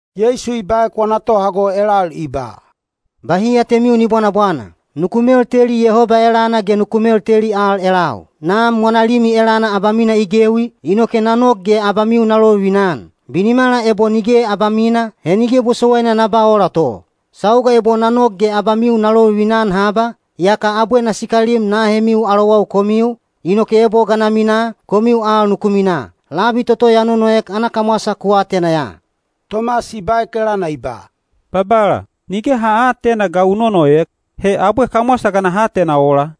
Yeisu i baek wana tohago elal i ba, “Bahi atemiu ni bwanabwana! Nuku melteli Yehoba elana ge nuku melteli al elau. Nam wana limi elana abamina i gewi, inoke na nok ge abamiu na lovivina-an. Binimala ebo nige abamina, he nige bosowaina na ba ola to. Sauga ebo na nok ge abamiu na lovivina-an haba, yaka abwe na sikalim na ahemiu alowau komiu, inoke ebo ga na minaa, komiu al nuku minaa. Labi toto ya nonoek ana kamwasa ku atena ya.” Tomas i baek elana i ba, “Babala, nige ha aatena te ga u nonoek, he abwe kamwasa ga naha atena ola?”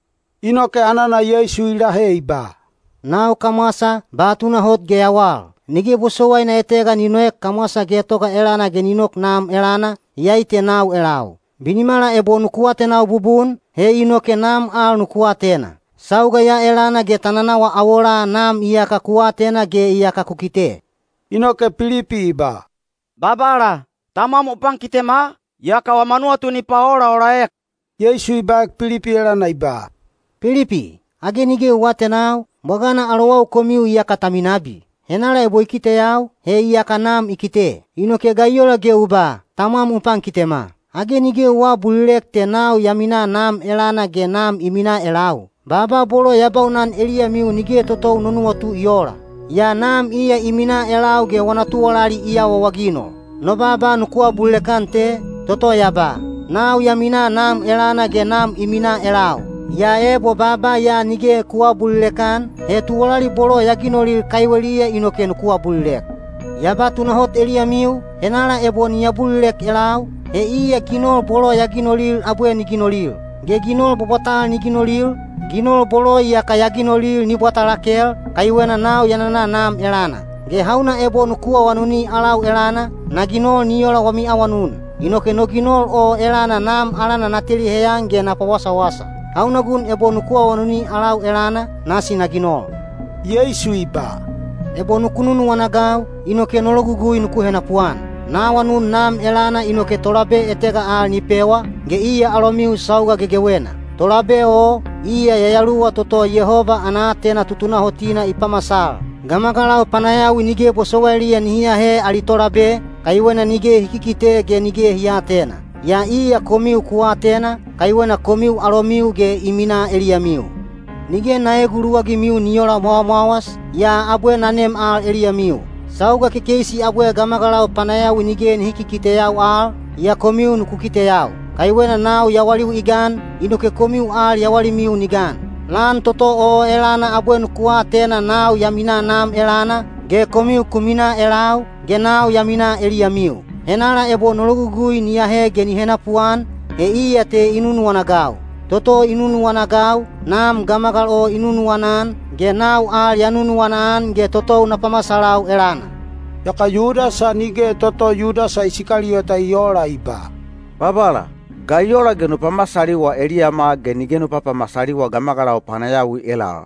Inoke anana Yeisu i lahe i ba, “Nau kamwasa, ba tunahot ge yawal. Nige bosowaina etega ni noek kamwasa getoga elana ge ni nok Nam elana, iyai te nau elau. Binimala ebo nuku atenau bubun, he inoke Nam al nuku atena. Sauga ya elana ge ta nanawa awolaa Nam iyaka ku atena ge iyaka ku kite.” Inoke Pilipi i ba, “Babala, Tamwam u pankitema, yaka wama nuwatu ni paolaolaek.” Yeisu i baek Pilipi elana i ba, “Pilipi, age nige u aatenau, bwagana alowau komiu iyaka ta minabi? Henala ebo i kiteyau, he iyaka Nam i kite. Inoke ga i ola ge u ba, ‘Tamwam u pankitema’? Age nige u aabulilek te nau ya minaa Nam elana ge Nam i minaa elau? Baaba bolo ya baunan eliyamiu nige totou no nuwatu i oola. Yaa Nam iya i minaa elau ge wana tuwalali i awaawaginol. No baaba nuku abulilek-an te, toto ya ba, ‘Nau ya minaa Nam elana ge Nam i minaa elau.’ Yaa ebo baaba ya nige ku aabulilek-an, he tuwalali bolo ya ginolil kaiweliya inoke nuku abulilek. Ya ba tunahot eliyamiu, henala ebo ni abulilek elau, he iya ginol bolo ya ginolil abwe ni ginolil. Ge ginol bwabwatal ni ginolil, ginol bolo iyaka ya ginolil ni bwata lakel, kaiwena nau ya nana Nam elana. Ge hauna ebo nuku awanuni alau elana, na ginol ni ola wami awanun. Inoke no ginol o elana Nam alana na teli heyan ge na pawasawasa. Hauna gun ebo nuku awanuni alau elana, nasi na ginol.” Yeisu i ba, “Ebo nuku nunuwana-agau, inoke no logugui nuku henapuan. Na awanun Nam elana inoke Tolabe etega al ni pewa, ge iya alomiu sauga gegewena. Tolabe o, iya Yayaluwa toto Yehoba ana aatena tutunahotina i pamasal. Gamagalau panayawi nige bosowailiya nihi ahe ali tolabe, kaiwena nige hi kikite ge nige hi aatena. Yaa iya komiu ku atena, kaiwena komiu alomiu ge i minaa eliyamiu. Nige na eeguluwagimiu ni oola mwawamwawas, yaa abwe na nem al eliyamiu. Sauga kekeisi abwe gamagalau panayawi nige nihi kikiteyau al, yaa komiu nuku kiteyau. Kaiwena nau yawaliu i gan, inoke komiu al yawalimiu ni gan. Lan toto o elana abwe nuku atena nau ya minaa Nam elana, ge komiu ku minaa elau, ge nau ya minaa eliyamiu. Henala ebo no logugui ni ahe ge ni henapuan, he iya te i nunuwana-agau. Toto i nunuwana-agau, Nam gamagal o i nunuwana-an, ge nau al ya nunuwana-an ge totou na pamasalau elana.” Yaka Yudasa (nige toto Yudasa Isikaliyota i oola) i ba, “Babala, ga i ola ge nu pamasaliwa eliyama ge nige nu papamasaliwa gamagalau panayawi elal?”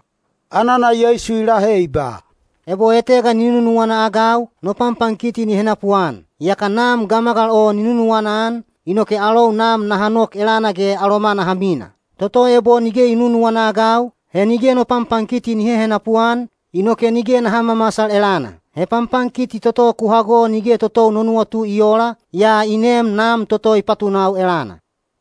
Anana Yeisu i lahe i ba, “Ebo etega ni nunuwana-agau, no panpankiti ni henapuan. Yaka Nam gamagal o ni nunuwana-an, inoke alou Nam naha nok elana ge aloma naha mina. Toto ebo nige i nunuwana-agau, he nige no panpankiti ni hehenapu-an, inoke nige naha mamasal elana. He panpankiti toto ku hago nige totou no nuwatu i oola, yaa i neem Nam toto i patunau elana.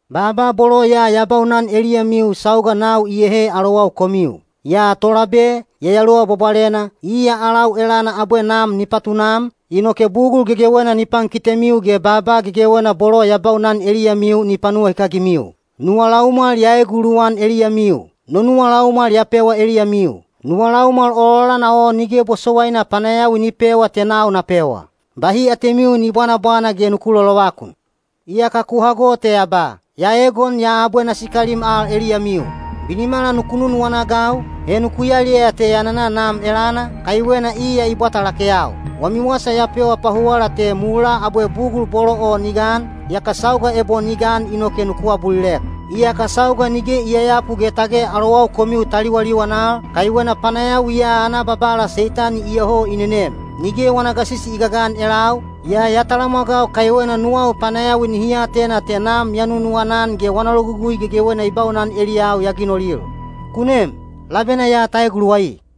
“Baaba bolo ya ya baunan eliyamiu sauga nau iyehe alowau komiu. Yaa Tolabe, Yayaluwa Bwabwalena, iya alau elana abwe Nam ni patunam, inoke bugul gegewena ni pankitemiu ge baaba gegewena bolo ya baunan eliyamiu ni panuwahikagimiu. “Nuwa laumwal ya eeguluwan eliyamiu; no nuwa laumwal ya pewa eliyamiu. Nuwa laumwal ololana o nige bosowaina panayawi ni pewa te nau na pewa. Bahi atemiu ni bwanabwana ge nuku lolovakun. Iyaka ku hago te ya ba, ‘Ya eegon yaa abwe na sikalim al eliyamiu.’ Binimala nuku nunuwana-agau, he nuku yaliyaya te ya nana Nam elana, kaiwena iya i bwata lakeyau. Wami wasa ya pewa pahuwala te mulaa abwe bugul bolo o ni gan, yaka sauga ebo ni gan inoke nuku abulilek. Iyaka sauga nige i yayapu ge tage alowau komiu ta liwaliwan al, kaiwena panayawi ya ana babala Seitani iyoho i nenem. Nige wana gasisi i gagan elau, yaa ya talamwagau kaiwena nuwau panayawi nihi atena te Nam ya nunuwana-an ge wana logugui gegewena i baunan eliyau ya ginolil. Ku nem, labena ya ta eguluwai.”